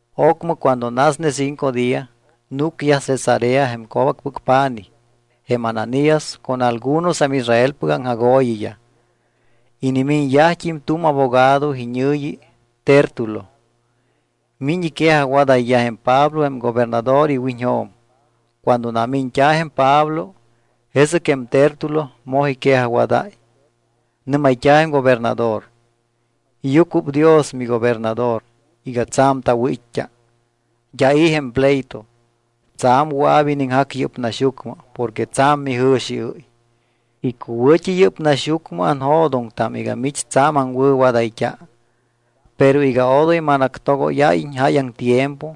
Ocmɨ cuando nasne cinco día, núcyaj Cesarea jém co̱bacpɨc pa̱nij jém Ananías con algunos jém Israelpɨc aŋjagooyiyaj. Inimiñyajt́im tu̱m abogado iñɨ̱yi Tértulo. Miñ iquejajwadayyaj jém Pablo jém gobernador iwiñjo̱m. Cuando namiñt́a̱ jém Pablo, jesɨc jém Tértulo moj iquejajwadáy. Nɨ́mayt́a̱ jém gobernador: —Iyucuɨpdios, migobernador, iga tsa̱m tawɨ̱it́t́a. D́a i̱ jém pleito. Tsa̱m wɨa̱p iniŋjac yɨ́p naxyucmɨ porque tsa̱m mijɨ̱xiɨ́y. Icuwɨ̱t́i yɨ́p naxyucmɨ anjo̱doŋtam iga mich tsa̱m aŋwɨ̱wadayt́a. Pero iga odoy manactogóyáyiñ jáyaŋ tiempo,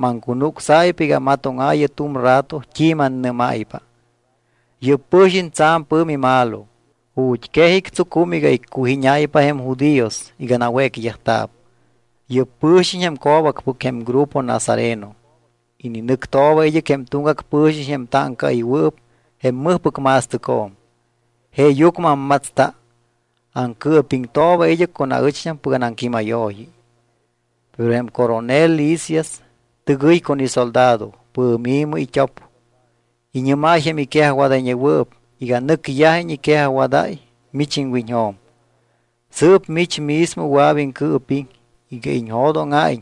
maŋcunucsáypa iga amatóŋaayɨ tu̱m rato t́i mannɨ́máypa. Yɨ́p pɨ̱xiñ tsa̱m pɨ̱mi malo, ju̱t́ quej ictsucum iga iccujíñáypa jém judíos iga nawécyajta̱p. Yɨ́p pɨ̱xiñ jém co̱bacpɨc jém grupo nazareno. Ininɨctooba id́ɨc jém tuŋgac pɨ̱xiñ jém táŋcaɨywɨɨp jém mɨjpɨc ma̱stɨcjo̱m. Jeeyucmɨ ammatsta. Aŋcɨɨpiŋtooba id́ɨc con aɨcht́ampɨc anaŋquímayooyi. Pero jém coronel Lisias tɨgɨy con isoldado, pɨ̱mi̱mɨ it́op. Iñɨ́máy jém iquejajwadayñewɨɨp iga nɨcyajiñ iquejajwadáy mich iŋwiñjo̱m. Sɨɨp mich mismo wɨa̱p iŋcɨɨpiŋ iga iñjo̱dóŋa̱iñ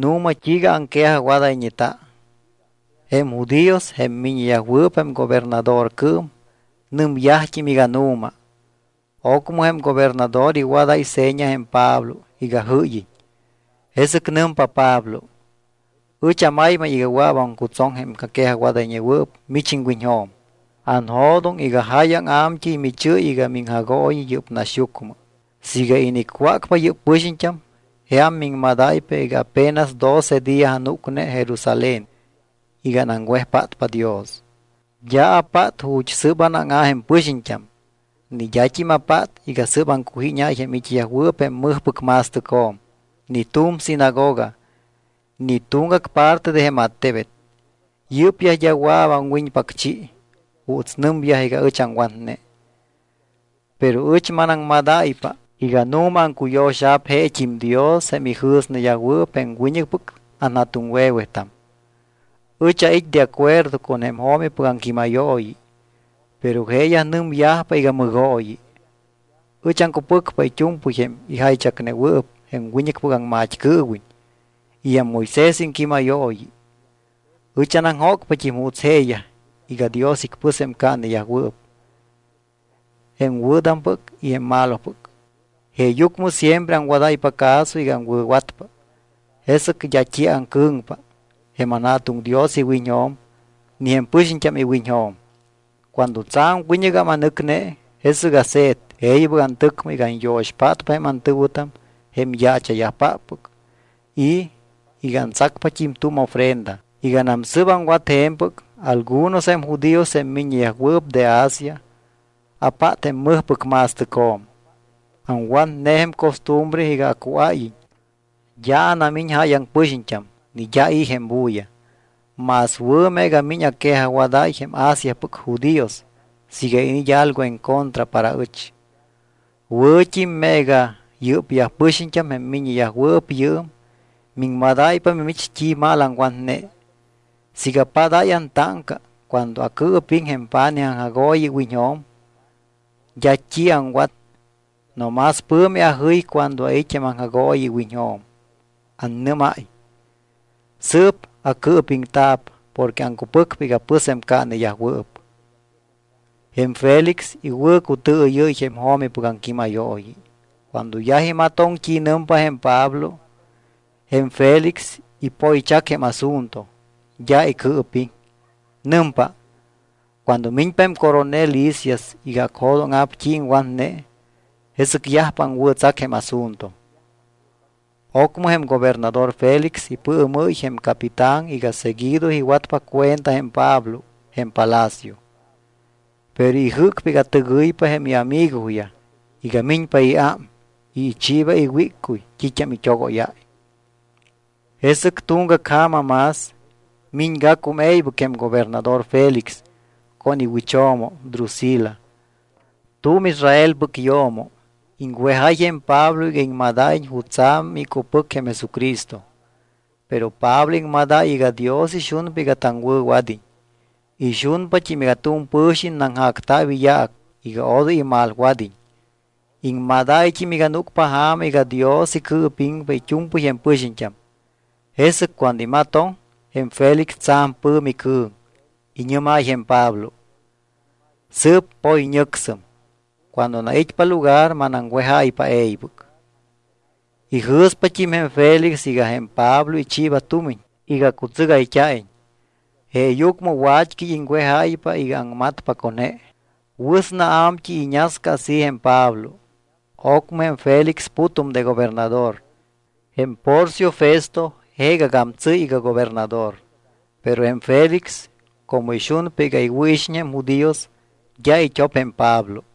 nu̱ma t́iiga aŋquejajwadayñeta. Jém judíos, jém miññeyajwɨɨp jém gobernadorcɨɨm, nɨmyajt́im iga nu̱ma. Ocmɨ jém gobernador iwadáy seña jém Pablo iga jɨ́yiñ. Jesɨc nɨmpa Pablo: —Ɨch amaymay iga wɨa̱p aŋcutsoŋ jém aquejajwadayñewɨɨp mich iŋwiñjo̱m. Anjo̱doŋ iga jáyaŋ a̱mt́ɨy michɨ́y iga miŋjagooyi yɨ́p naxyucmɨ. Siiga inicwácpa yɨ́p pɨxiñt́am, jeam miŋmadáypa iga apenas doce día anúcne Jerusalén iga anaŋwejpátpa Dios. D́a apát ju̱t́ sɨ́p anáŋa̱ jém pɨxiñt́am, ni d́at́im apát iga sɨ́p aŋcujíñáy jém it́yajwɨɨp jém mɨjpɨc ma̱stɨcjo̱m, ni tu̱m sinagoga, ni tuŋgac parte de jém attebet. Yɨ́pyaj d́a wɨa̱p awiñpacchi juuts nɨmyaj iga ɨch aŋwatne. Pero ɨch manaŋmadáypa iga nu̱ma aŋcuyo̱xa̱p jeet́im Dios jém ijɨ̱sneyajwɨɨp jém wiñɨcpɨc anja̱tuŋwe̱wetam. Ɨch ait́ de acuerdo con jém jo̱mipɨc aŋquímayooyi, pero jeeyaj nɨmyajpa iga mɨgooyi. Ɨch aŋcupɨcpa it́u̱mpɨy jém ijaychacnewɨɨp jém wiñɨcpɨc aŋmat́cɨɨwiñ y jém Moisés iŋquímayooyi. Ɨch anaŋjócpat́im juuts jeeyaj iga Dios icpɨspa jém caaneyajwɨɨp, jém wɨ̱tampɨc y jém malopɨc. Jeeyucmɨ siempre aŋwadáypa caso iga aŋwɨ̱watpa. Jesɨc d́a t́i aŋcɨ̱ŋpa jém tanJa̱tuŋ Dios iwiñjo̱m ni jém pɨxiñt́am iwiñjo̱m. ’Cuando tsa̱m wiñɨgam anɨcne, jesɨc ase̱t e̱ybɨc antɨcmɨ iga anyo̱xpátpa jém antɨ̱wɨtam jém yaacha̱yajpáppɨc y iga antsacpat́im tu̱m ofrenda. Iganam sɨ́p aŋwat je̱mpɨc, algunos jém judíos, jém miññeyajwɨɨp de Asia, apát jém mɨjpɨc ma̱stɨcjo̱m. Aŋwatne jém costumbre iga acuáyiñ. D́a anamiñ jáyaŋ pɨxiñt́am ni d́a i̱ jém bulla. Más wɨ̱ meega miñ aquejajwadáy jém Asiapɨc judíos siiga iniit́ algo encontra para ɨch. Wɨ̱t́im meega yɨ́pyaj pɨxiñt́am, jém miññeyajwɨɨp yɨɨm, miŋmadáypa mimich t́i mal aŋwatne, siiga apádáy antáŋca cuando acɨɨpiŋ jém pa̱nij aŋjagooyi iwiñjo̱m. D́a t́i aŋwat no más pɨ̱mi ajɨy cuando ait́ jém aŋjagooyi iwiñjo̱m, annɨ́máy: “Sɨɨp acɨɨpiŋta̱p porque aŋcupɨcpa iga pɨspa jém caaneyajwɨɨp.” Jém Félix iwɨ̱cutɨɨyɨ́y jém jo̱mipɨc aŋquímayooyi. Cuando yaj imatoŋ t́i nɨmpa jém Pablo, jém Félix ipoychac jém asunto; d́a icɨɨpiŋ. Nɨmpa: —Cuando miñpa jém coronel Lisias iga acjo̱dóŋa̱p t́i iŋwatne, jesɨc yajpa aŋwɨ̱tsac jém asunto. Ocmɨ jém gobernador Félix ipɨɨmɨ́y jém capitán iga seguido iwatpa cuenta jém Pablo jém palacio. Pero ijɨ́cpa iga tɨgɨypa jém iamigoyaj iga miñpa iám y ichiiba iwíccuy t́it́am it́ogóyáy. Jesɨc tuŋgac ja̱ma más, miñgacum e̱ybɨc jém gobernador Félix con iwɨcho̱mo Drusila, tu̱m Israelpɨc yo̱mo. Iŋwejáy jém Pablo iga iŋmadáyiñ jutsa̱p micupɨc jém Jesucristo. Pero Pablo iŋmadáy iga Dios ixunpa iga taŋwɨ̱wad́iñ, ixunpat́im iga tu̱m pɨ̱xiñ naŋjacta̱p iyaac iga odoy imalwad́iñ. Iŋmadáyt́im iga núcpa ja̱ma iga Dios icɨɨpiŋpa it́u̱mpɨy jém pɨxiñt́am. Jesɨc cuando imatoŋ, jém Félix tsa̱m pɨ̱mi cɨ̱ŋ. Iñɨ́máy jém Pablo: —Sɨɨp poyñɨcsɨm. Cuando anait́pa lugar manaŋwejáypa e̱ybɨc. Ijɨ̱spat́im jém Félix iga jém Pablo ichiiba tumiñ iga cutsɨgayt́a̱iñ. Jeeyucmɨ wat́cɨy iŋwejáypa iga aŋmatpa con je. Wɨsna a̱mt́ɨy iñasca así jém Pablo. Ocmɨ jém Félix putum de gobernador. Jém Porcio Festo jeegagam tsɨ́y iga gobernador. Pero jém Félix, como ixunpa iga iwɨ̱ixiñ jém judíos, d́a it́op jém Pablo.